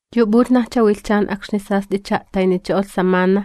Yu p'ulhnajcha wilhchan akxni sast'icha a'taynicho'olh samana,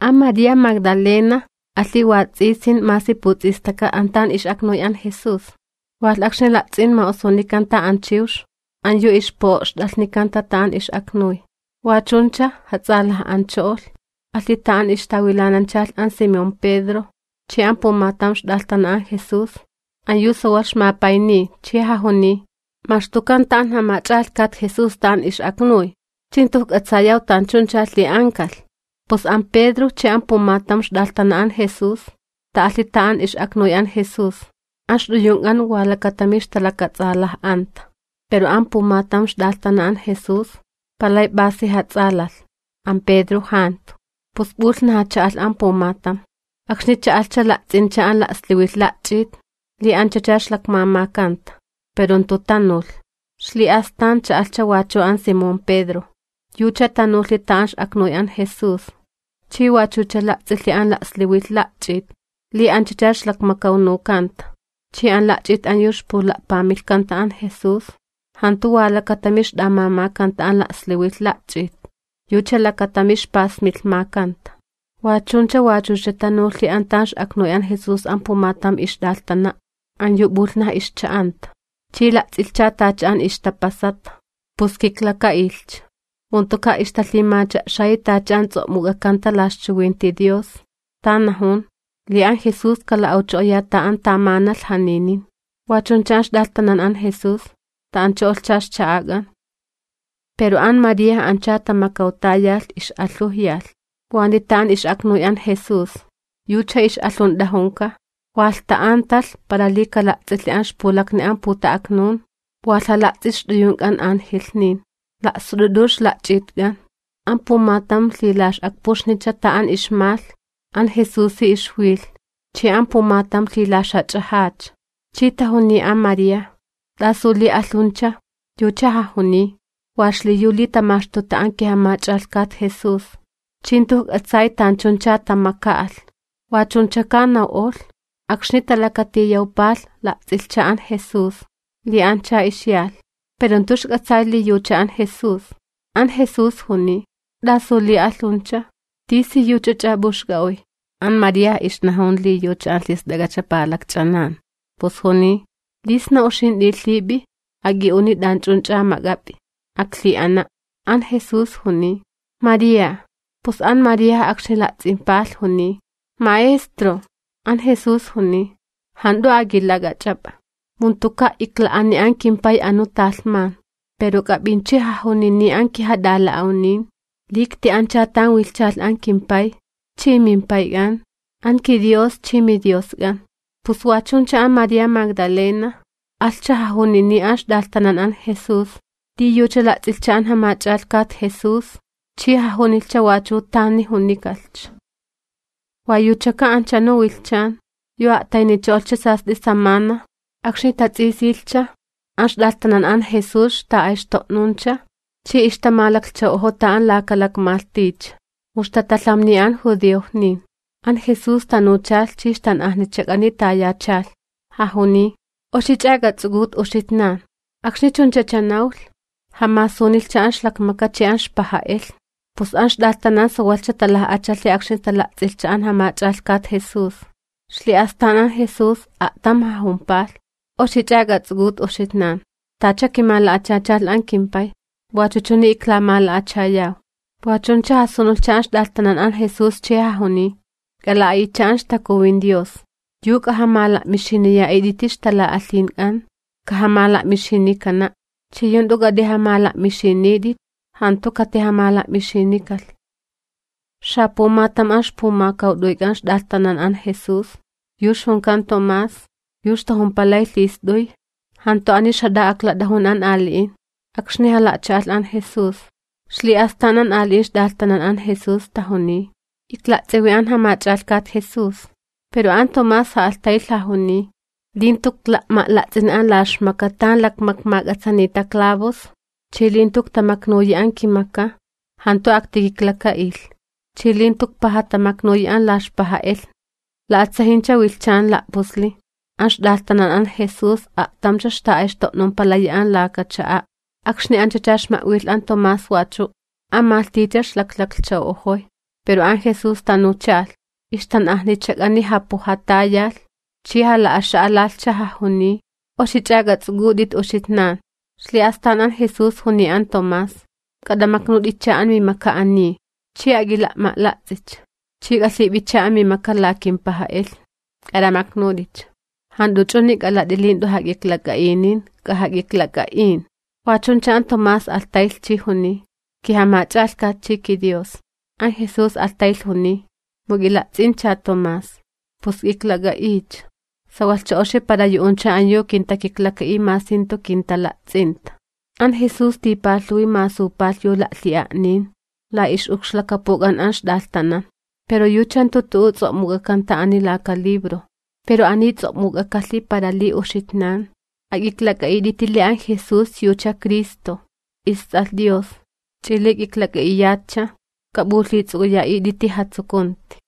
an María Magdalena alhi wats'isin masi puts'istaka an tan ix'aknuy an Jesús, walh akxni la'ts'in ma'osunikanta an chiwx an yu ixpu'o'xt'alhnikanta an tan ix'aknuy. Wa chuncha jats'alaj'ancho'olh, alhi an tan ixtawilananchalh an Simón Pedro chi an pumatam ixt'alhtana an Jesús an yu sawalh ixmapayniy, chi jajuniy: ―¡Maxtukanta an Jamach'alhkat Jesús an tan ix'aknuy, chi jantu ijk'atsayaw tanchuncha lhi'ankalh! Pus an Pedro chi an pumatam ixt'alhtana an Jesús ta'alhi an tan ix'aknuy an Jesús. An ixt'uyunk'an wa lakatami ixtalakats'alaj'anta, pero an pumatam ixt'alhtana an Jesús palay p'asi jats'alalh, an Pedro jantu, pus p'ulhnaja cha'alh an pumatam. Akxni cha'alhcha, la'ts'incha an la'sliwilh la'ch'it li anchacha ixlakmamakanta, pero jantu tanulh. Ixli'astan cha'alhcha wachu an Simón Pedro, yucha tanulhi an tan ix'aknuy an Jesús chi wachucha la'ts'ilhi an la'sliwilh la'ch'it li anchacha ixlakmakawnukanta. Chi an la'ch'it an yu ixpula'pamilhkanta an Jesús jantu wa lakatami ixt'amamakanta an la'sliwilh la'ch'it yucha lakatami ixpasmilhmakanta. Wa chuncha wachucha tanulhi an tan ix'aknuy an Jesús an pumatam ixt'alhana', an yu p'ulhnaj ixcha'anta, chi la'ts'ilhcha tacha an ixtapasata, pus kiklaka'ilhcha. Mu jantuka' ixtalhimacha'xayi tacha an ts'o'muk'akanta la ixchiwinti Dios, tan najun li an Jesús kala'awcho'oya an tan tamanalh janinin. Wa chuncha an ixt'alhtanan an Jesús ta'ancho'olhcha ixcha'ak'an. Pero an María, ancha tamakawtayalh, ix'alhujyalh, waniy an tan ix'aknuy an Jesús. Yucha ix'alhunt'ajunka, walh ta'antalh para li kala'ts'ilhi an ixpulakni an puta'aknun, walh jala'ts'ilh ixt'uyunk'an angelhnin, la'sut'ut'u ixla'ch'itk'an. An pumatam lhilax'akpuxnicha an tan ixmalh an Jesusi ixwilh chi an pumatam lhilaxjach'ajacha. Chi tajuniy an María: ―¿T'asu li alhuncha? Yucha jajuniy: ―Wa xliyu li tamaxtuta an kiJamach'alhkat Jesús chi jantu ijk'atsay tanchuncha tamaka'alh. Wachunchaka naw'olh, akxni talakatiyawpalh la'ts'ilhcha an Jesús li ancha ixyalh, pero jantu ixk'atsay li yucha an Jesús. An Jesús juniy: ―¿T'asu li alhuncha? ¿T'isiyuch'ach'a p'uxk'a'uy? An María ixnajun li yucha an lhist'ak'acha palakch'anan, pus juniy: ―Li sna uxint'i lhip'i, ak'i'uni t'anch'unch'a mak'ap'i, aklhi'ana'. An Jesús juniy: ―¡María! Pus an María akxni la'ts'impalh juniy: ―¡Maestro! An Jesús juniy: ―Jant'u ak'ilak'ach'ap'a, mu jantuka' ikla'ani an kimPay anu talhman. Pero k'ap'inchi jajunini an kijat'ala'awnin, li ikti'ancha tan wilhchalh an kimPay chi mimPayk'an, an kiDios chi miDiosk'an. Pus wa chuncha an María Magdalena alhcha jajunini an ixt'alhtanan an Jesús, li yucha la'ts'ilhcha an Jamach'alhkat Jesús chi jajunilhcha wachu tani junikalhcha. Wa yuchaka anchunu wilhchan yu a'taynicho'olhcha sast'i samana, akxni tats'isilhcha, an ixt'alhtanan an Jesús ixta'ayxto'nuncha chi ixtamalaklhchaw'ojota an lakalakmalhticha, mu ixtatalhamniya an judiojnin. An Jesús tanuchalh chi ixtan'ajnichak'ani tayachalh, jajuniy: ―¡Oxich'a k'ats'uk'ut uxitnan! Akxni chunchacha nawlh, jamasunilhcha an ixlakmaka chi an ixpaja'elhni. Pus an ixt'alhtanan sawalhcha talaj'achalhi akxni tala'ts'ilhcha an Jamach'alhkat Jesús. Ixli'astan an Jesús a'tam jajumpalh: ―¡Oxich'a k'ats'uk'ut uxitnan! Tacha kimala'achachalh an kimPay, wachu chuni iklamala'achayaw. Wa chuncha jasunulhcha an ixt'alhtanan an Jesús chi jajuniy: ―K'ala'a'itcha an Stalan'a Takuwin. Yu k'ajamala'mixiniya'it'iti ixtala'alhink'an, kajamala'mixinikana', ch'i yu jant'u k'at'ijamala'mixinit'it, jantu katijamala'mixinikalh. Xapumatam an ixpumakawt'uyk'an ixt'alhtanan an Jesús, yu ixjunkan Tomás, yu ixtajumpalay lhist'uy, jantu ani ixma't'ajun akxni an ali'in jala'cha'alh an Jesús. Ixli'astan an ali'in ixt'alhtanan an Jesús tajuniy: ―Ikla'ts'iwi an Jamach'alhkat Jesús. Pero an Tomás ja'alhtaylh jajuniy: ―Li jantu ikla'ma'la'ts'ini an la ixlakmaka tan lakmakmak'atsanita clavos chi li jantu iktamaknuyi an kimaka, jantu aktikiklaka'ilh, chi li jantu ikpajatamaknuyi an la ixpaja'elhni. La'atsajincha wilhchan la'pusli, an ixt'alhtanan an Jesús a'tamcha ixta'ayxto'numpalayi an laka cha'a', akxni anchacha ixma'wilh an Tomás wachu'. An malhticha ixlaklaklhchaw'ojoy, pero an Jesús tanuchalh, ixtan'ajnichak'ani japujatayalh chi jala'axa'alalhcha, jajuniy: ―¡Oxich'a k'ats'uk'ut'it uxitnan! Ixli'astan an Jesús juniy an Tomás: ―K'at'amaknut'icha amimaka ani, ch'i ak'ila'ma'la'ts'icha. Ch'i k'alhip'icha amimaka la kimpaja'elhni, k'at'amaknut'icha. Jant'u ch'uni k'alat'i li jant'u jak'iklak'a'inin, k'ajak'iklak'a'in. Wa chuncha an Tomás alhtaylh chi juniy: ―¡KiJamach'alhkat chi kiDios! An Jesús alhtaylh juniy: ―Mu k'ila'ts'incha Tomás, p'us k'iklak'a'iycha. Sawalhcha oxi para yu'uncha an yu kintakiklaka'iy masi jantu kintala'ts'inta. An Jesús tipalhuwi masupalh yu la'lhi'a'nin la ix'ukxlakapuk'an an ixt'alhtanan, pero yucha jantu tu'u ts'o'muk'akanta ani laka libro. Pero ani ts'o'muk'akalhi para li uxitnan k'ak'iklak'a'it'iti li an Jesús yucha Cristo, isTs'alh Dios, ch'i li k'iklak'a'iyatcha k'ap'ulhits'uk'uya'it'iti jatsukunti.